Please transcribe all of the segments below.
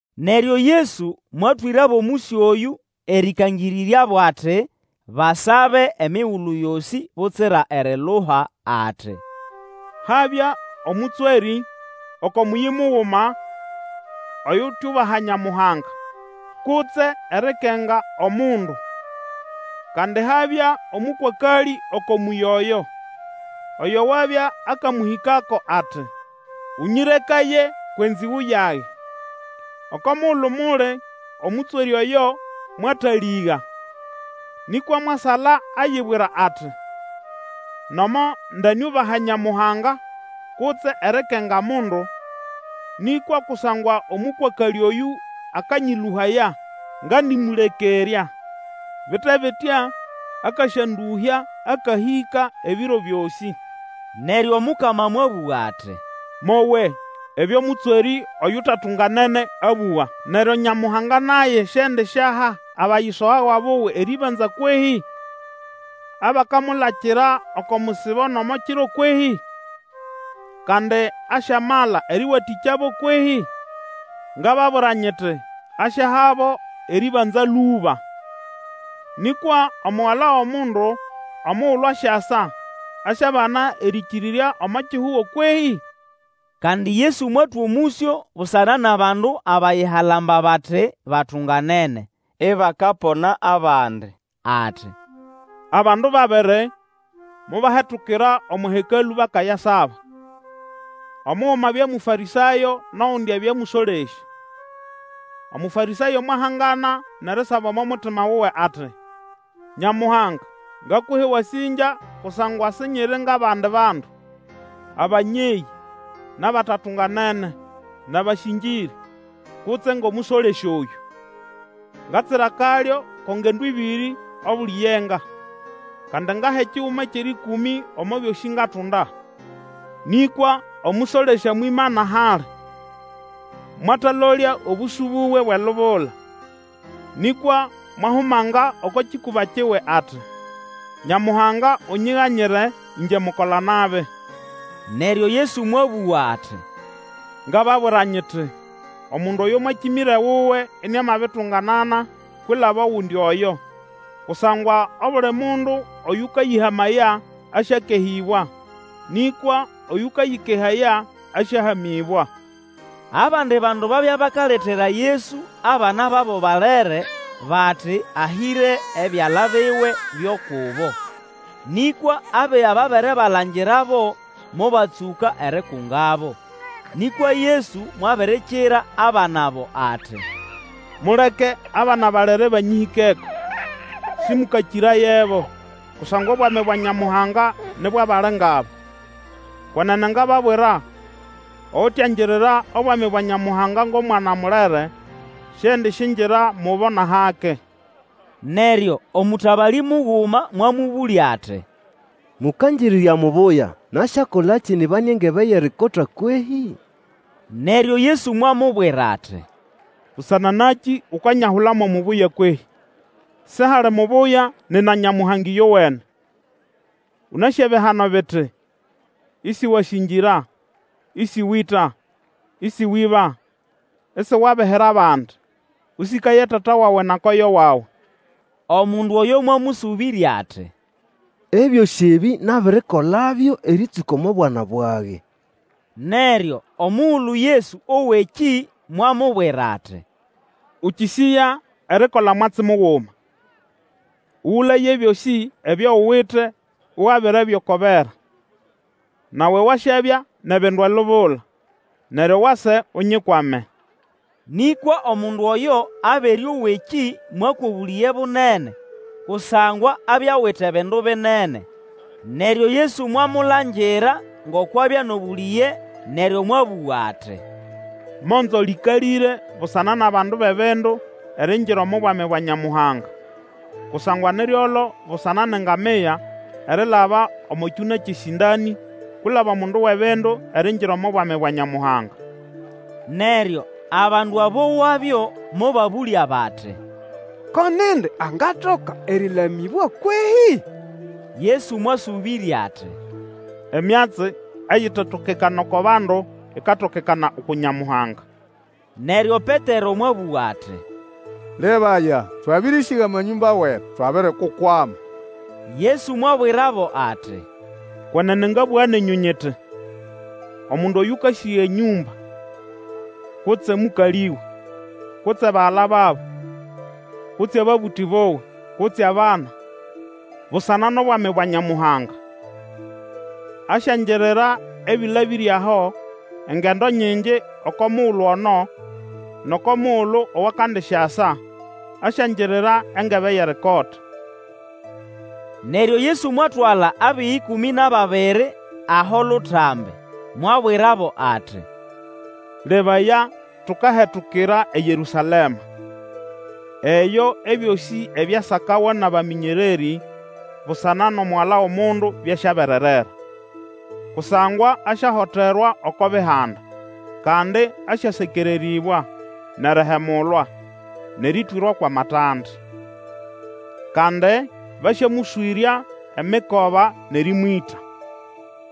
Neryo Yesu mwatwĩrabo omũsyo oyũ, erĩkangĩrĩryabo ati, Basabe emigulu yosĩ butsira eriluha, ati, Habya omũtswerĩ oko mũyĩ muguma oyutyubaha Nyamuhanga, kutse erikenga omundu. Kandi habya omũkwakalĩ oko mũyĩ oyo, oyo wabya akamũhĩkako, ati, Ũnyĩrekaye kwʼenzĩgũ yage. Oko mugulu muli, omũtswerĩ oyo mwatalĩga, nĩkwa mwasala ayibwira ati, Nomo ndeniubaha Nyamuhanga kutse erikenga mundu, nĩkwa kusangwa omũkwakalĩ oyũ akanyĩlũhaya ngandĩmũlekerya, bite bitya, akasyandũhya akahĩka ebiro byosĩ. Neryo Omukama mwabũga ati, Mowe ebyo mũtswerĩ oyutatunganene abũga. Neryo Nyamuhanga naye siendisyaha abayisogawa buwe erĩbanza kwehĩ? Abakamulakira oko musibo nʼomo kiro kwehi? Kandi asyamala erĩwatĩkyabo kwehĩ? Ngababwira nyiti, Asyahabo erĩbanza lũba. Nĩkwa Omugala wʼOmundu omugulu asyasa, asyabana erĩkĩrĩrya omo kihugo kwehĩ? Kandi Yesu mwatwa omũsyo busana nʼabandu abayihalamba bati batunganene, ibakapona abandi. Ati, Abandu babiri mobahetukira omo Hekalũ bakayasaba; omuguma abya Mũfarĩsayo nʼogundi abya mũsolesya. Omũfarĩsayo mwahangana nʼerisaba omo mutima wuwe ati, Nyamuhanga, ngakuha ewasĩngya kusangwa sinyiri ngʼabandi bandu, abanyeyĩ, nʼabatatunganene, nʼabasĩngĩrĩ, kutse ngʼomũsolesya oyũ. Ngatsira akalyo ko ngendo ĩbĩrĩ obuli yenga; kandi ngaha ekiguma kyʼerĩkũmĩ omo byosĩ ngatunda. Nĩkwa omũsolesya mwimana hali, mwatalolya obũsũ buwe bwʼelubula, nĩkwa mwahumanga oko kĩkũba kiwe ati, Nyamuhanga, unyiganyire, ĩngye mukola-nabi! Neryo Yesu mwabũga ati, Ngababwira nyiti, omundu oyo mwakĩmĩra ewuwe iniamabitunganana kwilaba ogundi oyo, Kusangwa obuli mundu oyũkayĩhamaya, asyakehĩbwa. Nĩkwa oyũkayĩkehaya, asyahamĩbwa. Abandi bandu babya bakaletera Yesu abana babo balere, bati ahĩre ebyala biwe byo kubo. Nĩkwa abiga babere balangirabo, mobatsũka erikungabo. Nĩkwa Yesu mwabirikira abana abo ati, Muleke abana balere banyĩhĩkeko, Sĩmũkakĩrayebo; kusangwa Obwami bwa Nyamuhanga ni bwʼabali ngʼaba. Kwenene ngababwira, oyutyangirira obwami bwa Nyamuhanga ngʼomwana mulere, siendisyingira mubo nʼahake. Neryo omũtabalĩ muguma mwamũbũlya ati, Mũkangĩrĩrya mubuya, nasyakolakĩ nyibane engebe yʼerikota kwehĩ? Neryo Yesu mwamubwira ati, Busana nakĩ ukanyahula mo mubuya kwehĩ? Sihali mubuya nina Nyamuhanga ĩyowene. Ũnasĩ ebihano biti, Isiwasĩngĩra; Ĩsĩwĩta; Ĩsĩwĩba; isiwabihira abandi; Ũsĩkaye tata wawe na koyo wawe. Omundu oyo mwamũsũbĩrya ati, Ebyosĩ ebĩ nabirikolabyo erĩtsũka omo bwana bwage. Neryo omugulu Yesu owa ekĩ, mwamubwira ati, Ũkĩsĩya erikola mwatsi muguma. Ũgũlaye ebyosĩ ebyo uwite ugabirebyo oko bera, nawe wasyabya nʼebindu elubula; neryo wase Unyikwame. Nĩkwa omundu oyo abere owa ekĩ, mwakwa obũlĩge bunene, kusangwa abya awite bindu binene. Neryo Yesu mwamulangira ngoko abya nʼobũlĩge neryo mwabũga ati, Monzo lĩkalĩre busana nʼabandu bʼebindu eriingira omo Bwami bwa Nyamuhanga! Kusangwa ni ryolo busana nʼengamia erilaba omo kyũna kyʼesĩndanĩ kwilaba omundu wʼebindu eriingira omo Bwami bwa Nyamuhanga. Neryo abandu abowabyo mobabũlya bati, Ko nindi angatoka erĩlamĩbwa kwehĩ? Yesu mwasũbĩrya ati, Emyatsi eyitetokekana oko bandu, ikatokekana uku Nyamuhanga. Neryo Petero mwabũga ati, Lebaya, twabĩrĩsĩga amanyũmba wetu, twabirikukwama. Yesu mwabwirabo ati, Kwenene ngabũga nenyũ nyiti, omundu Oyũkasĩga enyũmba, kutse omũkalĩwe, kutse bagala babo, kutse ababũtĩ buwe, kutse abana, busana nʼobwami bwa Nyamuhanga, asyangirira ebĩlabĩre aho engendo nyingi oko mugulu ono, nʼoko mugulu owakandisyasa, asyangirira engebe yʼerikota. Neryo Yesu mwatwala abiga ĩkũmĩ nʼababiri aho lutambi, mwabwirabo ati, Lebaya, tukahetukira eYerũsalema. Eyo ebyosĩ ebyasakawa nʼabamĩnyererĩ busana nʼomugala wʼOmundu byasyabererera. Kusangwa asyahoterwa oko Bihanda, kandi asyasekererĩbwa, nʼerihemulwa, nʼerĩtwĩrwako amatande. Kandi basyamũswĩrya emikoba nʼerĩmwĩta.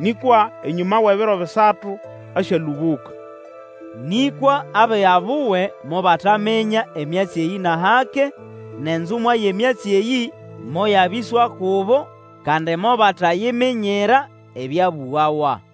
Nĩkwa enyũma wʼebiro bisatu asyalũbũka. Nĩkwa abiga buwe mobataminya emyatsi eyĩ nʼahake, nʼenzumwa yʼemyatsi eyĩ moyabĩswa kubo, kandi mobatayiminyira ebyabũgawa.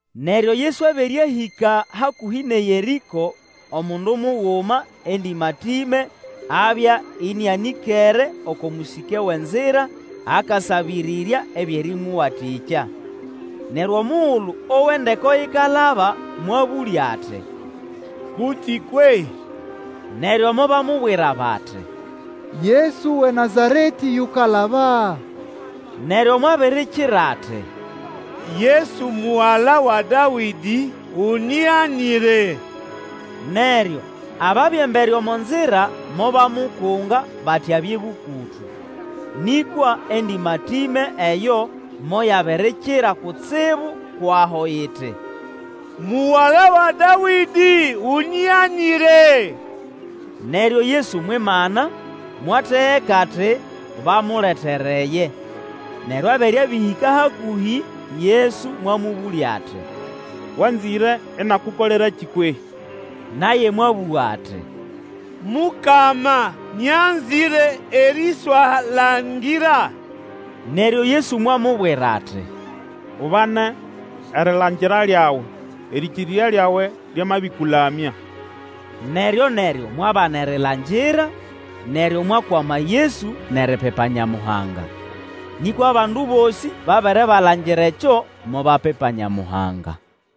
Neryo Yesu abere ahĩka hakũhĩ nʼeYerĩko, omundu muguma endĩmatĩme abya ĩnĩanĩkere oko mũsĩke wʼenzira akasabĩrĩrya ebyʼerĩmũwatĩkya. Neryo omugulu owa endeko ikalaba, mwabũlya ati, Kuti kwehĩ? Neryo mobamubwira bati, Yesu wʼeNazaretĩ yukalaba. Neryo mwabirikira ati, Yesu, mugala wa Dawĩdĩ, unyiganyire! Neryo ababya embere omo nzira mobamukunga, bati abye bũkũtũ, nĩkwa endĩmatĩme eyo moyabirikira kutsibu kwʼaho iti, Mugala wa Dawĩdĩ, unyiganyire! Neryo Yesu mwimana, mwategeka ati bamuletereye; neryo abere abĩhĩka hakũhĩ Yesu mwamũbũlya ati, Wanzĩre inakukolerakĩ kwehĩ? Naye mwabũga ati, Mukama, nyanzĩre eriswalangira. Neryo Yesu mwamubwira ati, Ubane erilangira lyawe, erĩkĩrĩrya lyawe lyamabĩkũlamya. Neryo-neryo mwabana erilangira, neryo mwakwama Yesu, nʼeripipa Nyamuhanga. Nĩkwa abandu bosĩ babere balangira ekyo, mobapipa Nyamuhanga.